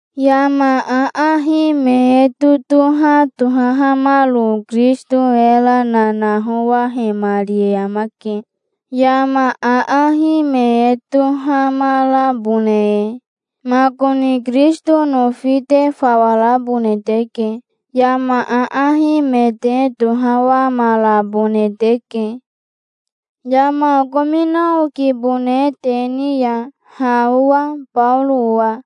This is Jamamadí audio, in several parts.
Yama aahi me e totoha tohahamaro Kirisito era nanahowahemari e amake, yama aahi me e tohamarabone e. Makoni Kirisito nofi te fawa rabone teke. Yama aahi me te tohawamarabone teke. Yama okomina okibone te ni ya, ha owa, Baoro owa.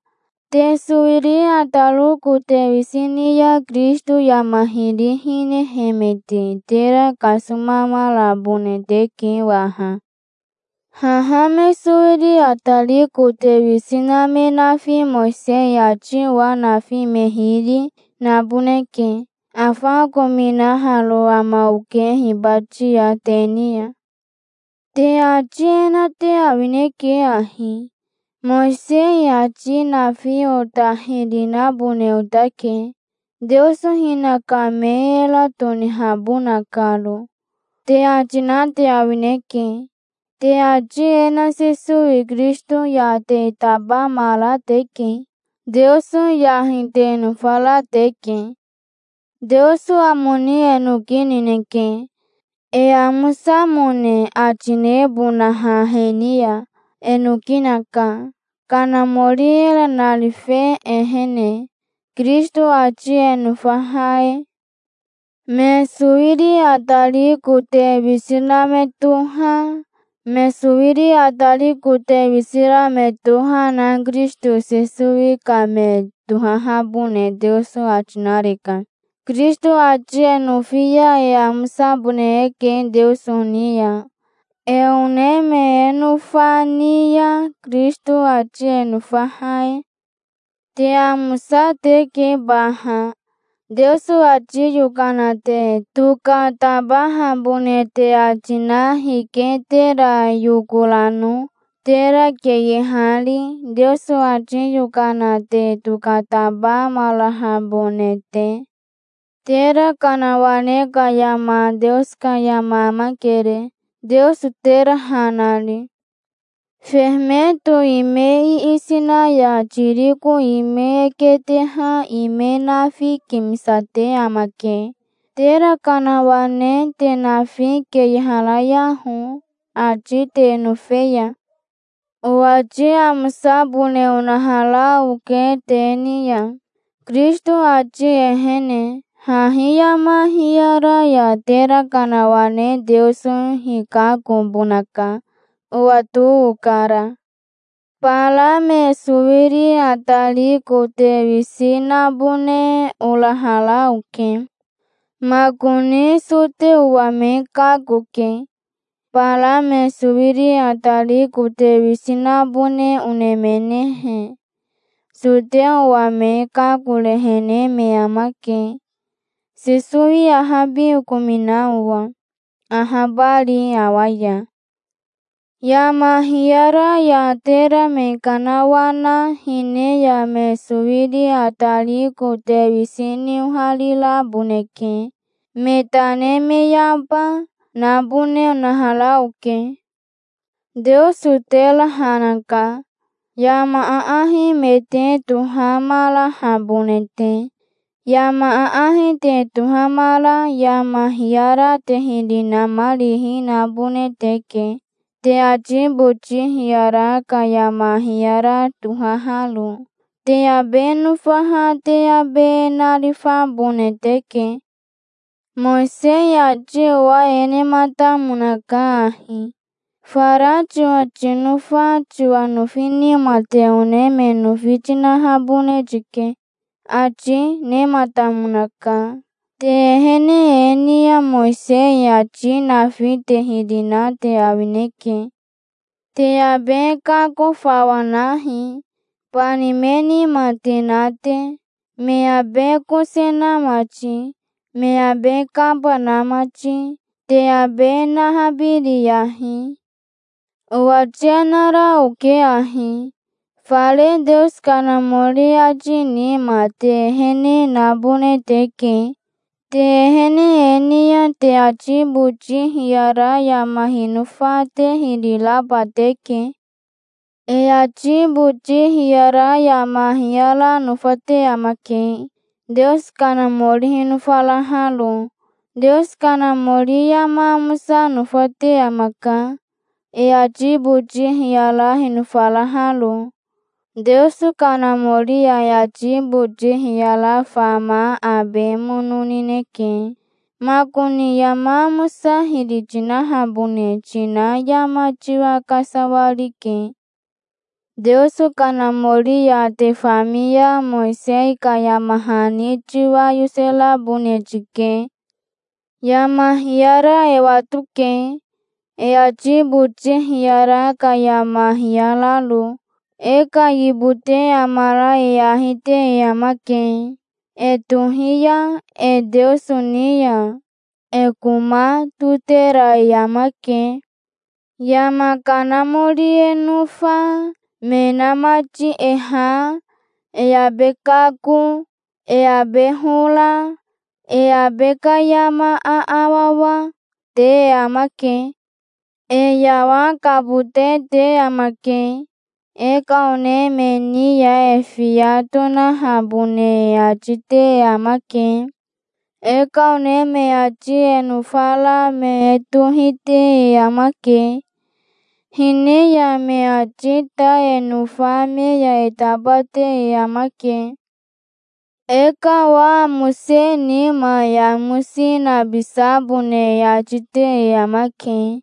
Te sowiri ataro kote wisi ni ya Kirisito yama hiri hinehemete tera kasomamarabone teke waha. Haha me sowiri atari kote wisi na me nafi Mowisei ati owa nafi me hiri, naboneke. Afa okominaharo ama oke hibati ya te ni ya. Te ati e na te awineke ahi: "Mowisei ati nafi ota hiri nabone otake, Teoso hinaka me era tonihabona karo", te ati na te awineke. Te ati e na Sesowi Kirisito ya te tabamara teke. Teoso yahi te nofara teke. Teoso amo ni e noki nineke, e amosamone ati nebonaha he ni ya. E noki naka, Kanamori era narife ehene, Kirisito ati e nofaha e. Me sowiri atari kote wisi na me toha, me sowiri atari kote wisi ra me toha na Kirisito Sesowi ka me tohahabone Teoso ati nareka. Kirisito ati e nofi ya e amosabone eke Teoso ni ya, e one me e nofa ni ya, Kirisito ati e nofaha e. Te amosa teke baha. Teoso ati yokana te tokatabahabone te ati na hike tera yokorano, tera keyehari, Teoso ati yokana te tokatabamarahabone te? Tera kanawane ka yama Teoso ka yama amakere, Teoso tera ha nari. Fehemeto ime iisi na ya tiriko ime e keteha ime nafi kimisate amake. Tera kanawane te nafi keyeharayaho, ati te nofe ya. Owati amosabone onahara oke te ni ya, Kirisito ati ehene. Hahi yama hiyara ya tera kanawane Teoso hikakobonaka. Owato okara. Bara me sowiri atari kote wisi nabone orahara oke. Makoni soteo owa me kakoke. Bara me sowiri atari kote wisi nabone onemenehe, soteo owa me kakorehene me amake, Sesowi ahabi okomina owa, ahabari awa ya. Yama hiyara ya tera me kanawana hine ya me sowiri atari kote wisi ni ohariraboneke. Me tane me yaba, nabone onahara oke. Teoso tera ha naka, yama aahi me te tohamarahabone te. Yama aahi te tohamara yama hiyara te hiri namarihi nabone teke, te ati boti hiyara ka yama hiyara tohaharo. Te abe nofaha te abe narifabone teke. Mowisei ati owa e nematamonaka ahi: "Fara tiwa tinofa tiwa nofi nima te one me nofi tinahabone tike", ati nematamonaka. Te ehene e ni ya Mowisei ati nafi te hiri na te awineke. Te abe kako fawa nahi, bani me nima te na te, me abe kose na mati, me abe kaba na mati. Te abe nahabiriyahi. Owati e nara oke ahi: Fare Teoso Kanamori ati nima te ehene nabone teke. Te ehene e ni ya te ati boti hiyara yama hinofa te hiri raba teke. E ati boti hiyara yama hiyara nofate amake, Teoso Kanamori hinofaraharo. Teoso Kanamori yama amosa nofate amaka, e ati boti hiyara hinofaraharo. Teoso Kanamori ya e ati boti hiyara fama abe mono nineke. Makoni yama amosa hiri tinahabone tina yama tiwa kasawarike. Teoso Kanamori ya te fami ya Mowisei ka yama hani tiwa yoserabone tike. Yama hiyara e watoke, e ati boti hiyara ka yama hiyararo. E ka yibote amara e ahi te e amake, e tohiya e Teoso ni ya. E koma totera e amake. Yama kanamori e nofa, me inamati e ha, e abe kako, e abe hora, e abe ka yama aawawa, te amake. E yawakabote te amake. E ka one me ni ya e fiya tonahabone e ati te e amake. E ka one me ati e nofara me e tohite e amake. Hine ya me ati ta e nofa me ya e tabate e amake. E ka owa amose nima e amosi nabisabone e ati te e amake.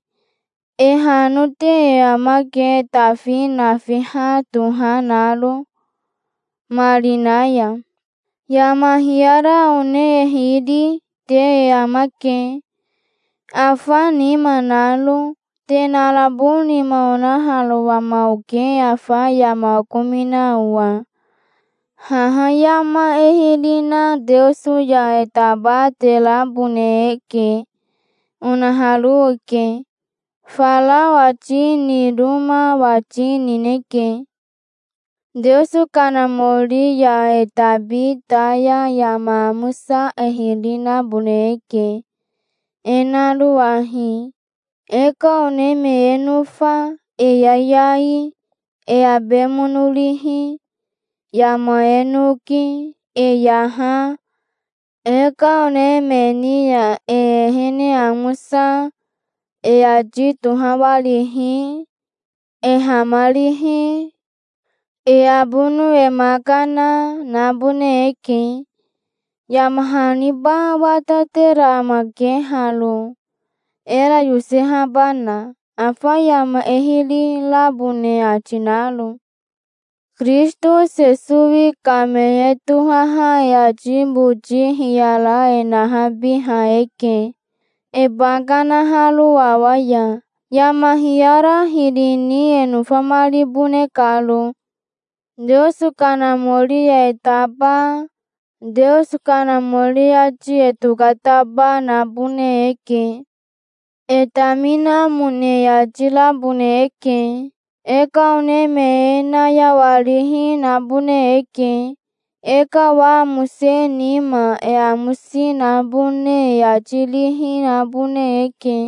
E hanote e amake e tafi nafiha toha naro, marina ya. Yama hiyara one e hiri, te e amake, afa nima naro. Te narabo nima onaharo ama oke afa yama okomina owa. Haha yama e hiri na Teoso ya e tabaterabone eke onaharo oke. Fara owati niroma owati nineke. Teoso Kanamori ya e tabi ta ya yama amosa e hiri nabone eke, e naro ahi: e ka one me e nofa, e yayai, e abe mono rihi, yama e noki, e yaha, e ka one me ni ya e ehene amosa, e ati tohawarihi, e hamarihi, e abono e ma kana, nabone eke. Yama haniba watatera amake haro, era yosehabana, afa yama e hiri rabone ati naro. Kirisito Sesowi ka me e tohaha e ati boti hiyara e nahabiha eke, e ba kanaharo awa ya, yama hiyara hiri ni e nofamaribone karo. Teoso Kanamori ya e taba, Teoso Kanamori ati e tokataba nabone eke. E taminamone e ati rabone eke. E ka one me e nayawarihi nabone eke. E ka owa amose nima e amosi nabone e ati rihi nabone eke.